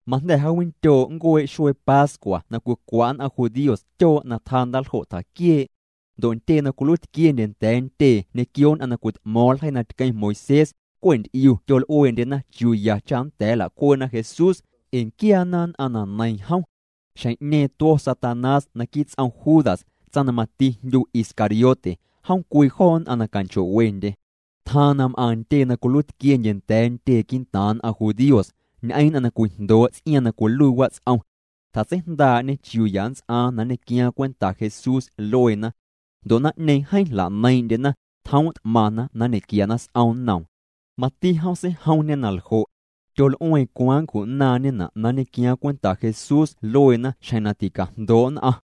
Majnda̱ jaawindyoo' nncuee' xuee pascua na cwicwa' nn'aⁿ judíos tyoo' na tjaa ndaaljo' tjaquiee'. Ndo' ntyee na cwiluiitquiendye nda̱a̱ ntyee ñequio nn'aⁿ na cwit'mo̱o̱ⁿ ljeii na tqueⁿ Moisés, cwe' nty'iu tyol'ueendyena chiuu ya cha nnda̱a̱ nla'cuee'na Jesús, ee nquiaana nn'aⁿ na neiiⁿ jom. Xjeⁿ'ñeeⁿ tuo̱ Satanás naquii' ts'om Judas, tsaⁿ na mati jndyu Iscariote. Jom cwii joo nn'aⁿ na canchoo'wendye. Tjaaⁿ na m'aⁿ ntyee na cwiluiitquiendye nda̱a̱ ntyee quii'ntaaⁿ nn'aⁿ judíos, ñ'eⁿ nn'aⁿ na cwijndoo' ts'iaaⁿ na cwiluii wats'om. Tjatseijndaa'ñê chiuu ya nnts'aaⁿ na nñequiaaⁿ cwenta Jesús lueena. Ndo' naⁿ'ñeeⁿ jeeⁿ jla'neiiⁿ'ndyena, tjoom' t'maⁿna na nñe'quiana s'om nnoom. Mati jom seijomñê na ljo'. Tyol'ueeⁿ cwaaⁿ nncju'naaⁿñena' na nñequiaaⁿ cwenta Jesús lueena xjeⁿ na ticajndoo' nn'aⁿ.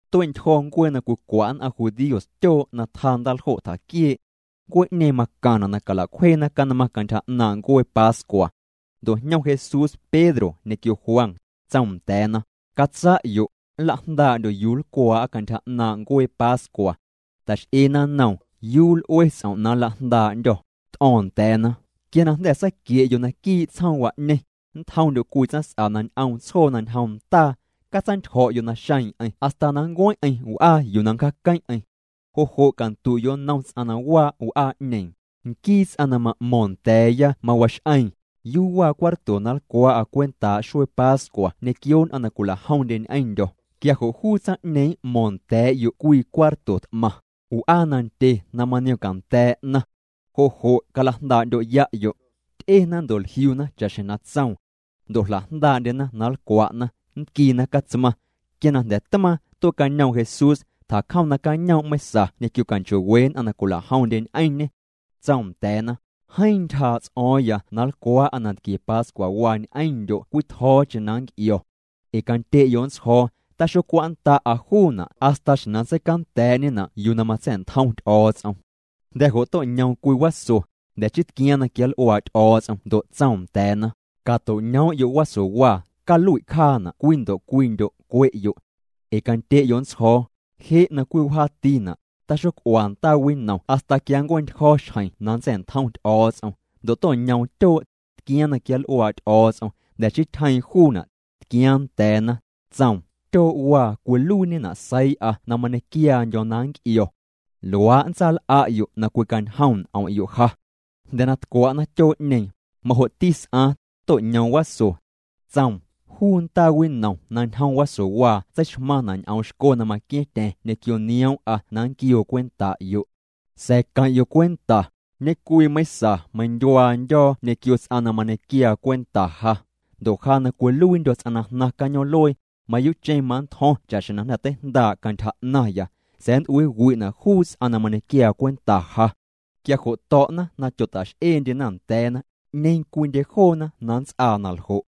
Tue'ntyjo̱ ncuee na cwicwa' nn'aⁿ judíos tyoo' na tjaa ndaaljo' tjaquiee'. Ncuee'ñeeⁿ macaⁿna' na cala'cwjeena canmaⁿ cantyja 'naaⁿ' ncuee pascua. Ndo' jñom Jesús Pedro ñequio Juan, tsoom nda̱a̱na: —Catsa'yo', nlajndaa'ndyo' yuu na nlcwaa'a cantyja 'naaⁿ' ncuee pascua. Ta'x'eena nnoom: —¿Yuu l'ue ts'om' na nlajndaa'ndyô̱? T'o̱o̱ⁿ nda̱a̱na: —Quia na jnda̱ saaquie'yo' naquii' tsjoomwa'ñeⁿ, nntjomndyo' cwii tsaⁿs'a na ñ'oom tsjoo na ñjom ndaa. Catsaantyjo̱'yo' naxeeⁿ'eⁿ hasta na nncueⁿ'eⁿ w'aa yuu na nncjaaqueⁿ'eⁿ. Jo' jo' candu'yo' nnom ts'aⁿ na waa' w'aa'ñeeⁿ: “Nquii ts'aⁿ na ma'mo̱ⁿ nda̱a̱ya mawax'eeⁿ: ¿Yuu waa cuarto na nlcwaa'â cwentaa' xuee pascua ñequio nn'aⁿ na cwila'jomndye ñ'eⁿndyo̱?” Quia jo' juu tsaⁿ'ñeeⁿ m'mo̱o̱ⁿ nda̱a̱'yo' cwii cuarto t'maⁿ, w'aa nandye na maniomcanda̱a̱' 'naⁿ. Jo' jo' calajndaa'ndyo'ya'yo'. Ty'ena ndo' jliuna cha'xjeⁿ na tsoom. Ndo' jla'jndaa'ndyena na nlcwa'na, nntquiina catsmaⁿ. Quia na jnda̱ tmaaⁿ, tue'cañoom Jesús, tjacjom nacañoom' meiⁿsa ñequio canchoo'we nn'aⁿ na cwila'jomndye ñ'eⁿñê. Tsoom nda̱a̱na: —Jeeⁿ ntyjaa' ts'o̱o̱ⁿya na nlcwaa'a nantquie pascuawaa ñ'eⁿndyo' cwii tjo̱o̱cheⁿ na nnc'io̱. Ee candye'yo' nntsjo̱o̱, taxocwa'nnda'a juuna' hasta xjeⁿ na jnda̱ seicanda̱a̱'ñena' yuu na matsa̱'ntjom Ty'o̱o̱ts'om. Jnda̱ jo' to'ñoom cwii waso, jnda̱ chii tquiaaⁿ na quianl'uaa' Ty'o̱o̱ts'om ndo' tsoom nda̱a̱na: —Cato'ñoom'yo' wasowaa, calui' cjaana' cwii ndo' cwiindyo', cwe'yo'. Ee candye'yo' nntsjo̱o̱, je' na cwii wjaatina', taxoc'ua ndaawinom hasta quia nncue'ntyjo̱ xjeⁿ na nntsa̱'ntjom Ty'o̱o̱ts'om. Ndo' to'ñoom tyoo', tquiaaⁿ na quianl'uaa' Ty'o̱o̱ts'om, jnda̱ chii tyjeeⁿ juuna', tquiaaⁿ nda̱a̱na. Tsoom: —Tyoo'waa cwiluiiñena' seii'a na mañequiaandyo̱ na nnc'io̱. Luaa' nntsaal'a'yo' na cwicañjom n'om'yo' ja. Jnda̱ na tcwa'na tyoo'ñeeⁿ, majo'ti s'aaⁿ, to'ñoom waso. Tsoom: —Juu ndaa winom na ñjom wasowaa tseixmaⁿna' ñ'oom xco na maqua̱ⁿtya̱ⁿ ñequio nioom'a na nnquioo cwenta'yo'. ’Sa̱a̱ queⁿ'yo' cwenta, ñe'cwii meiⁿsa na cañom' meindyuaandyo̱ ñequio ts'aⁿ na mañequiaa cwenta ja. Ndo' ja na cwiluiindyo̱ ts'aⁿ na jnaⁿ cañoom'luee, mayuu'cheⁿ manntjo̱ⁿ cha'xjeⁿ na jnda̱ teijndaa' cantyja 'naⁿya, sa̱a̱ nnt'uiiwi'na' juu ts'aⁿ na mañequiaa cwenta ja. Quia jo' to̱'na na tyota'x'eendyena nda̱a̱na, 'ñeeⁿ cwiindye joona na nnts'aa na ljo'.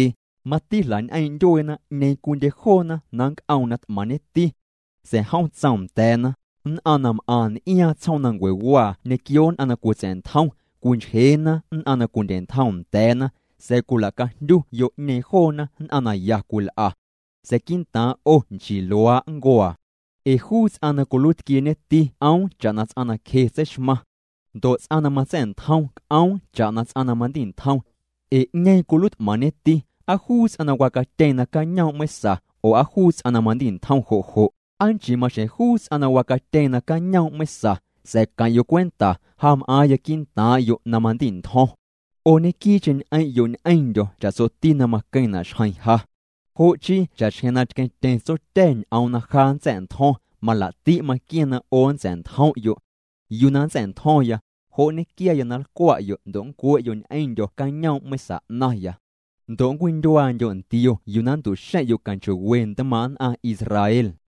Mati jla'ñ'eeⁿ' ndyueena 'ñeeⁿ cwiindye joona na nnc'oom na t'maⁿñeti. Sa̱a̱ jom tsoom nda̱a̱na: —Nn'aⁿ na m'aⁿ n'iaaⁿ tsjoomnancuewaa ñequio nn'aⁿ na cwitsa̱'ntjom, cwinchjeena nn'aⁿ na cwindye'ntjom nda̱a̱na, sa̱a̱ cwila'cajndyu yo'ñeeⁿ joona nn'aⁿ na ya cwil'a. Sa̱a̱ quii'ntaaⁿ' 'o nchii luaa' nncuaa. Ee juu ts'aⁿ na cwiluiitquieñeti c'oom cha'na ts'aⁿ na cje tseixmaⁿ. Ndo' ts'aⁿ na matsa̱'ntjom c'oom cha'na ts'aⁿ na mandi'ntjom. Ee ¿'ñeeⁿ cwiluiit'maⁿñeti, aa juu ts'aⁿ na wacatyeeⁿ nacañoom' meiⁿsa, oo aa juu ts'aⁿ na mandi'ntjom jo' jo'? ¿Aa nchii maxjeⁿ juu ts'aⁿ na wacatyeeⁿ nacañoom' meiⁿsa? Sa̱a̱ queⁿ'yo' cwenta, ja m'aaⁿya quii'ntaaⁿ'yo' na mandi'ntjo̱ⁿ. ’'O ñequii'cheⁿ ñ'eⁿ'yo' ñ'eⁿndyo̱ cha'tsoti na maqueⁿna' xjeⁿ ja. Jo' chii cha'xjeⁿ na tqueⁿtyeⁿ Tsotya̱ya ñ'oom na ja nntsa̱'ntjo̱ⁿ, malaa'ti' maqua̱ⁿ na 'o nntsa̱'ntjom'yo'. Yuu na nntsa̱'ntjo̱ⁿya, jo' nñequiaya na nlcwa'yo' ndo' nncwe'yo' ñ'eⁿndyo̱ cañoom' meiⁿsa 'naⁿya. Ndo' nncwindyuaandyo' ntio yuu na nntu'xeⁿ'yo' canchoo'we ntmaaⁿ' nn'aⁿ Israel.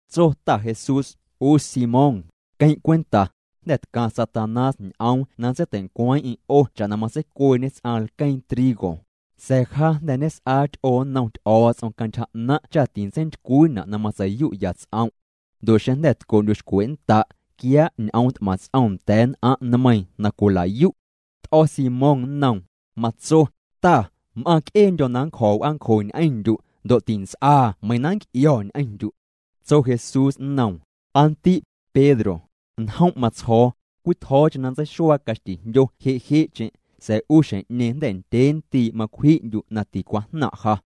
Tso ta Jesús: —'U Simón, queⁿ' cwenta, jnda̱ tcaⁿ Satanás ñ'oom na nntseitei'ncweeⁿ'eⁿ 'o cha'na matseicueeñe ts'aⁿ lqueeⁿ trigo, sa̱a̱ ja jnda̱ ñes'aa ty'oo nnom Ty'o̱o̱ts'om cantyja 'naⁿ' cha tintseintycwiina' na matsei'yu'ya' ts'om'. Ndo' xeⁿ jnda̱ tco'ndyu'xcwe'nnda', quiaa' ñ'oom t'maⁿ ts'om nda̱a̱ nn'aⁿ' nmeiiⁿ na cwila'yu'. T'o̱ Simón nnoom, matso: —Ta, m'aaⁿc'eendyo̱ na nncjo̱ w'aancjo ñ'eⁿndyu'. Ndo' tints'aa meiiⁿ na nnc'io̱ ñ'eⁿndyu'. Tso Jesús nnoom: —Aa ndi', Pedro, njom' matsjo̱o̱, cwii tjo̱o̱cheⁿ na nntseixuaa caxtijndyo je'je'cheⁿ, sa̱a̱ 'u xjeⁿ'ñeeⁿ jnda̱ ndyee ndii' macwji'ndyu' na ticwajnaⁿ' ja.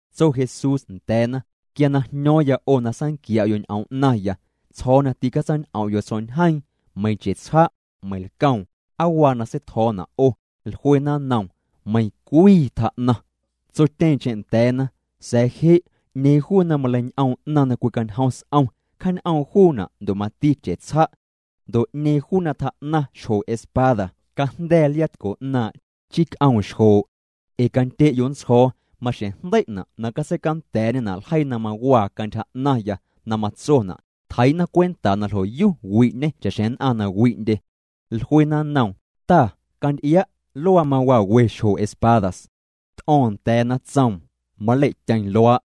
Tso Jesús nda̱a̱na: —Quia na jño̱o̱ⁿya 'o na saanquia'yo' ñ'oom 'naⁿya, tsjo̱o̱ na tîcatsañ'om'yo' tsjo̱'ñjeeⁿ, meiⁿ chetsja', meiⁿ lcoom, ¿aa waa na seitjo̱o̱na' 'o? Jluena nnoom: —Meiⁿcwii tjaa'naⁿ. Tsotyeeⁿcheⁿ nda̱a̱na: —Sa̱a̱ je', 'ñeeⁿ juu na maleiñ'oom 'naⁿ na cwicañjom s'om, cjaañ'oom juuna' ndo' mati chetsja'. Ndo' 'ñeeⁿ juu na tjaa'naⁿ xjo espada, cajnda̱a̱ liaatco 'naaⁿ', chii c'oom xjoo'. Ee candye'yo' nntsjo̱o̱, maxjeⁿ jndei'na' na catseicanda̱a̱'ñena' ljeii na mawaa cantyja 'naⁿya na matsona': “Tjeii'na cwenta na ljo'yu wi'ñê cha'xjeⁿ nn'aⁿ na wi'ndye.” Jluena nnoom: —Ta, canty'ia', luaa mawaa we xjo espadas. T'o̱o̱ⁿ nda̱a̱na, tsoom: —Malei'tyeⁿ luaa'.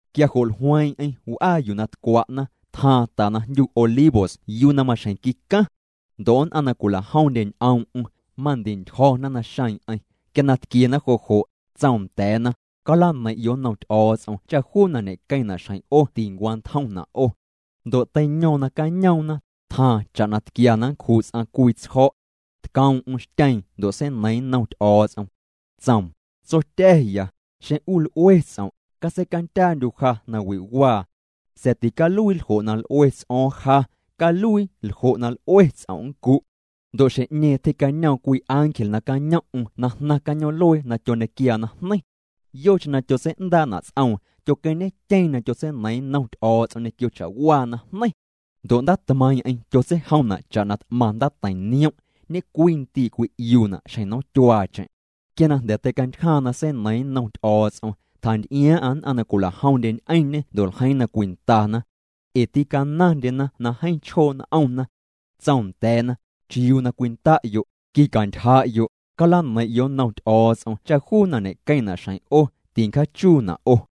Quia jo' jlueeⁿ'eⁿ w'aa yuu na tcwa'na, tjaaⁿ ta na jndyu Olivos yuu na maxjeⁿ quicaⁿ. Ndo' nn'aⁿ na cwila'jomndye ñ'oom'm, mandi'ntyjo̱na naxeeⁿ'eⁿ. Quia na tquiena jo' jo', tsoom nda̱a̱na: —Calaneiⁿ'yo' nnom Ty'o̱o̱ts'om cha juu na ñequeⁿna' xjeⁿ 'o tincwantjomna' 'o. Ndo' teiño̱o̱ⁿ nacañoomna, tjaaⁿ cha'na tquia na nncju' ts'aⁿ cwii tsjo̱'. Tcoom'm xtyeeⁿ ndo' seineiiⁿ nnom Ty'o̱o̱ts'om. Tsoom: —Tsotya̱ya, xeⁿ 'u l'ue ts'om', catseicandyaandyu' ja nawi'waa. Sa̱a̱ ticaluii ljo' na l'ue ts'o̱o̱ⁿ ja, caluii ljo' na l'ue ts'om' nncu'. Ndo' xjeⁿ'ñeeⁿ tyje'cañoom cwii ángel nacañom'm na jnaⁿ cañoom'luee na tyoñequiaa najneiⁿ. Yocheⁿ na tyotsei'ndaa'na' ts'oom, tyoqueⁿñetyeeⁿ na tyotseineiiⁿ nnom Ty'o̱o̱ts'om ñequio cha'waa najneiⁿ. Ndo' ndaatmeiiⁿ'eⁿ tyotseijomna' cha'na t'maⁿ ndaateiⁿ niom', ñecwii ndii' cwi'iuuna' xjeⁿ nomtyuaacheⁿ. Quia na jnda̱ teicantyjaaⁿ na seineiiⁿ nnom Ty'o̱o̱ts'om, tjantyjaaⁿ'aⁿ nn'aⁿ na cwila'jomndye ñ'eⁿñê ndo' ljeiiⁿ na cwindana. Ee tîcanaⁿndyena na jeeⁿ chjoo' n'omna. Tsoom nda̱a̱na: —¿Chiuu na cwinda'yo'? Quicantyja'yo', calaneiⁿ'yo' nnom Ty'o̱o̱ts'om cha juu na ñe'queⁿna' xjeⁿ 'o, tincjaachuuna' 'o.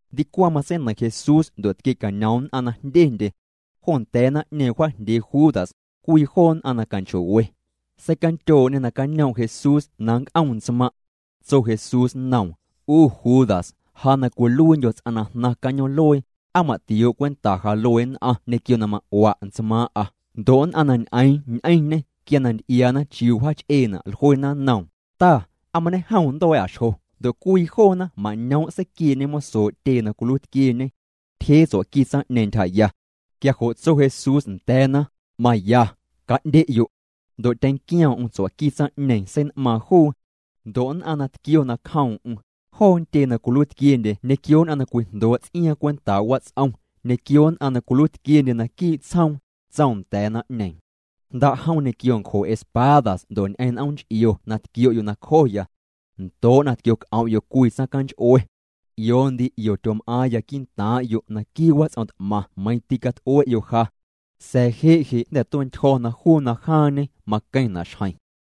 Ndicwaⁿ matseineiⁿ Jesús ndo' tquie'cañom nn'aⁿ na jndyendye. Jo nda̱a̱ naⁿ'ñeeⁿ wjaajndyee Judas, cwii joo nn'aⁿ na canchoo'we. Seicandyoo'ñê nacañoom' Jesús na nnc'om ntsmaⁿ'. Tso Jesús nnoom: —'U Judas, ja na cwiluiindyo̱ ts'aⁿ na jnaⁿ cañoom'luee, ¿aa ma'tioo' cwenta ja luee nn'aⁿ ñequio na ma'ua' ntsmaaⁿ'a? Ndo' nn'aⁿ na ñ'eeⁿ ñ'eⁿñê, quia na nty'iaana chiuu wjaach'eena', jluena nnoom: —Ta, ¿aa mañejom nntua̱a̱'a xjo? Ndo' cwii joona mañoom' seiquiee'ñe mosoo' tyee na cwiluiitquieñe. Tyjee tsua'qui tsaⁿ'ñeeⁿ ntyjaya. Quia jo' tso Jesús nda̱a̱na: —Maya, ca'ndye'yo'. Ndo' tyenquioom'm tsua'qui tsaⁿ'ñeeⁿ, sein'maaⁿ juu. Ndo' nn'aⁿ na tquio nacjoom'm, joo ntyee na cwiluiitquiendye ñequio nn'aⁿ na cwijndoo' ts'iaaⁿ cwentaa' wats'om, ñequio nn'aⁿ na cwiluiitquiendye naquii' tsjoom, tsoom nda̱a̱ naⁿ'ñeeⁿ: —Jnda'jom ñequio ncjo espadas ndo' ñ'eⁿ n'oom nch'io na tquio'yo' nacjoya. Ndoo' na tquioc'om'yo' cwii tsaⁿcanch'ue. 'Io ndii 'io tyom'aaⁿya quii'ntaaⁿ'yo' naquii' wats'om t'maⁿ meiⁿ tîcat'ue'yo' ja. Sa̱a̱ je' je' jnda̱ tue'ntyjo̱ na juu na jaaⁿñe maqueⁿna' xjeⁿ.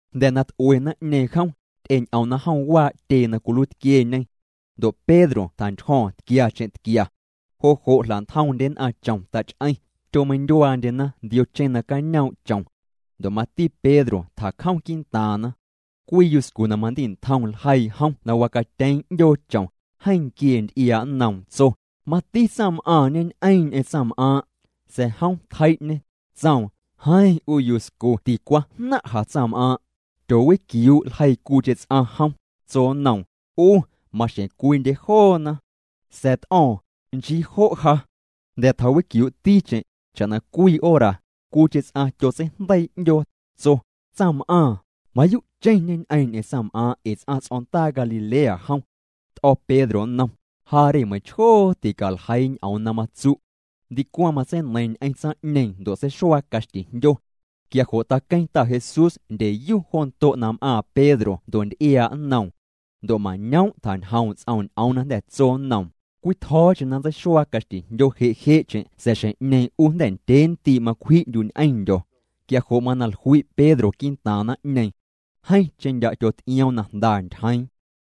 Jnda̱ na t'ue naⁿ'ñeeⁿ jom, ty'eñ'omna jom waa' tyee na cwiluiitquieñe. Ndo' Pedro tjantyjo̱o̱ⁿ tquiacheⁿ tquia. Jo' jo' jla'ntjoomndye nn'aⁿ chom tach'eⁿ, tyomeindyuaandyena ndiocheⁿ nacañoom' chom. Ndo' mati Pedro tjacjom quii'ntaaⁿna. Cwii yuscu na mandi'ntjom ljeii jom na wacatyeeⁿ 'ndyoo chom, jeeⁿ nquiee nty'iaa' nnoom ndo' tso: —Mati tsaⁿm'aaⁿ ñeñ'eeⁿ ñ'eⁿ tsaⁿm'aaⁿ'. Sa̱a̱ jom tjei'ñê, tsoom: —Jeeⁿ 'u yuscu ticwajnaⁿ'a tsaⁿm'aaⁿ'. Tyoowiquiuu' ljeii cwiicheⁿ ts'aⁿ jom, tso nnoom: —'U, maxjeⁿ cwiindye joona. Sa̱a̱ t'o̱o̱ⁿ: —Nchii jo' ja. Jnda̱ tjawiquiuu'ticheⁿ, cha'na cwii hora, cwiicheⁿ ts'aⁿ tyotseijndeii' 'ndyoo, tso: —Tsaⁿm'aaⁿ, mayuu'cheⁿ ñeñ'eeⁿ ñ'eⁿ tsaⁿm'aaⁿ' ee ts'aⁿ ts'o̱ndaa Galilea jom. T'o̱ Pedro nnom: —Ja re, meiⁿchjoo ticaljeii ñ'oom na matsu'. Ndicwaⁿ matseineiiⁿ ñ'eⁿ tsaⁿ'ñeeⁿ ndo' seixuaa caxtijndyo. Quia jo' taqueⁿ Ta Jesús ndyeyu jo ndo' na m'aaⁿ Pedro ndo' nty'iaa' nnoom. Ndo' mañoom' tjañjoom' ts'oom ñ'oom na jnda̱ tso nnoom: “Cwii tjo̱o̱cheⁿ na nntseixuaa caxtijndyo je'je'cheⁿ sa̱a̱ xjeⁿ'ñeeⁿ 'u jnda̱ ndyee ndii' macwji'ndyu' ñ'eⁿndyo̱.” Quia jo' mana jlui' Pedro quii'ntaaⁿ naⁿ'ñeeⁿ. Jeeⁿcheⁿ ndya' tyoty'ioom na jnda ntyjeeⁿ.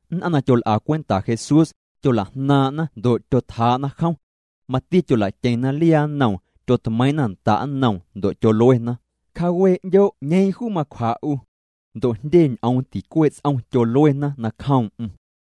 Nn'aⁿ na tyol'a cwenta Jesús, tyola'jnaaⁿ'na ndo' tyotjaa'na jom. Mati tyola'tyeⁿna liaa nnoom, tyotmeiiⁿ'na nda' nnoom ndo' tyoluena: —Cjaawee' 'ndyo' 'ñeeⁿ juu macwja' 'u. Ndo' jndye ñ'oom ticuee' ts'om tyoluena nacjoom'm.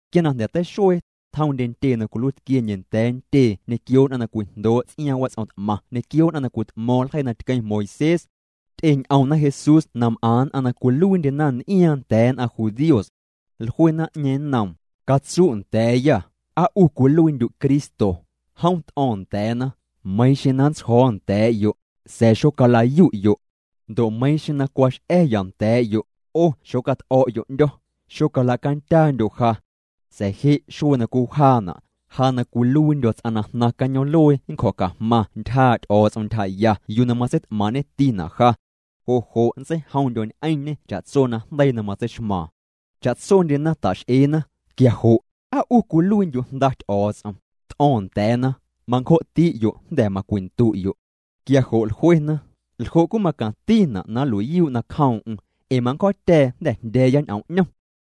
Quia na jnda̱ teixuee, tjomndye ntyee na cwiluiitquiendye nda̱a̱ ntyee ñequio nn'aⁿ na cwijndoo' ts'iaaⁿ wats'om t'maⁿ ñequio nn'aⁿ na cwit'mo̱o̱ⁿ ljeii na tqueⁿ Moisés. Ty'eñ'omna Jesús na m'aⁿ nn'aⁿ na cwiluiindyena n'iaaⁿ nda̱a̱ nn'aⁿ judíos. Jlue naⁿ'ñeeⁿ nnoom: —Catsu' nda̱a̱yâ, ¿aa 'u cwiluiindyu' Cristo? Jom t'o̱o̱ⁿ nda̱a̱na: —Meiiⁿ xeⁿ na nntsjo̱o̱ nda̱a̱'yo', sa̱a̱ xocala'yu'yo'. Ndo' meiiⁿ xeⁿ na cwax'a̱ya nda̱a̱'yo', 'o xocat'o̱'yo' 'ndyo̱, xocalacandyaandyo' ja. Sa̱a̱ je' xuee na cwii wjaana', ja na cwiluiindyo̱ ts'aⁿ na jnaⁿ cañoom'luee nncjo̱cajmaⁿ ntyjaa' Ty'o̱o̱ts'om ntyjaya yuu na matseit'maaⁿ'ñetina' ja. Jo' jo' nntseijomndyo̱ ñ'eⁿñê cha'tso najndeii na matseixmaaⁿ. Cha'tsondyena ta'x'eena: —Quia jo' ¿aa 'u cwiluiindyu' Jnda Ty'o̱o̱ts'om? T'o̱o̱ⁿ nda̱a̱na: —Mancjo'ti'yo' jnda̱ macwindu'yo'. Quia jo' jluena: —¿Ljo' cwii macaⁿtina' na nlui'yuu' nacjoom'm? Ee mancjo̱o̱tya̱a̱ jnda̱ jndya̱a̱ya ñ'oom 'ñom.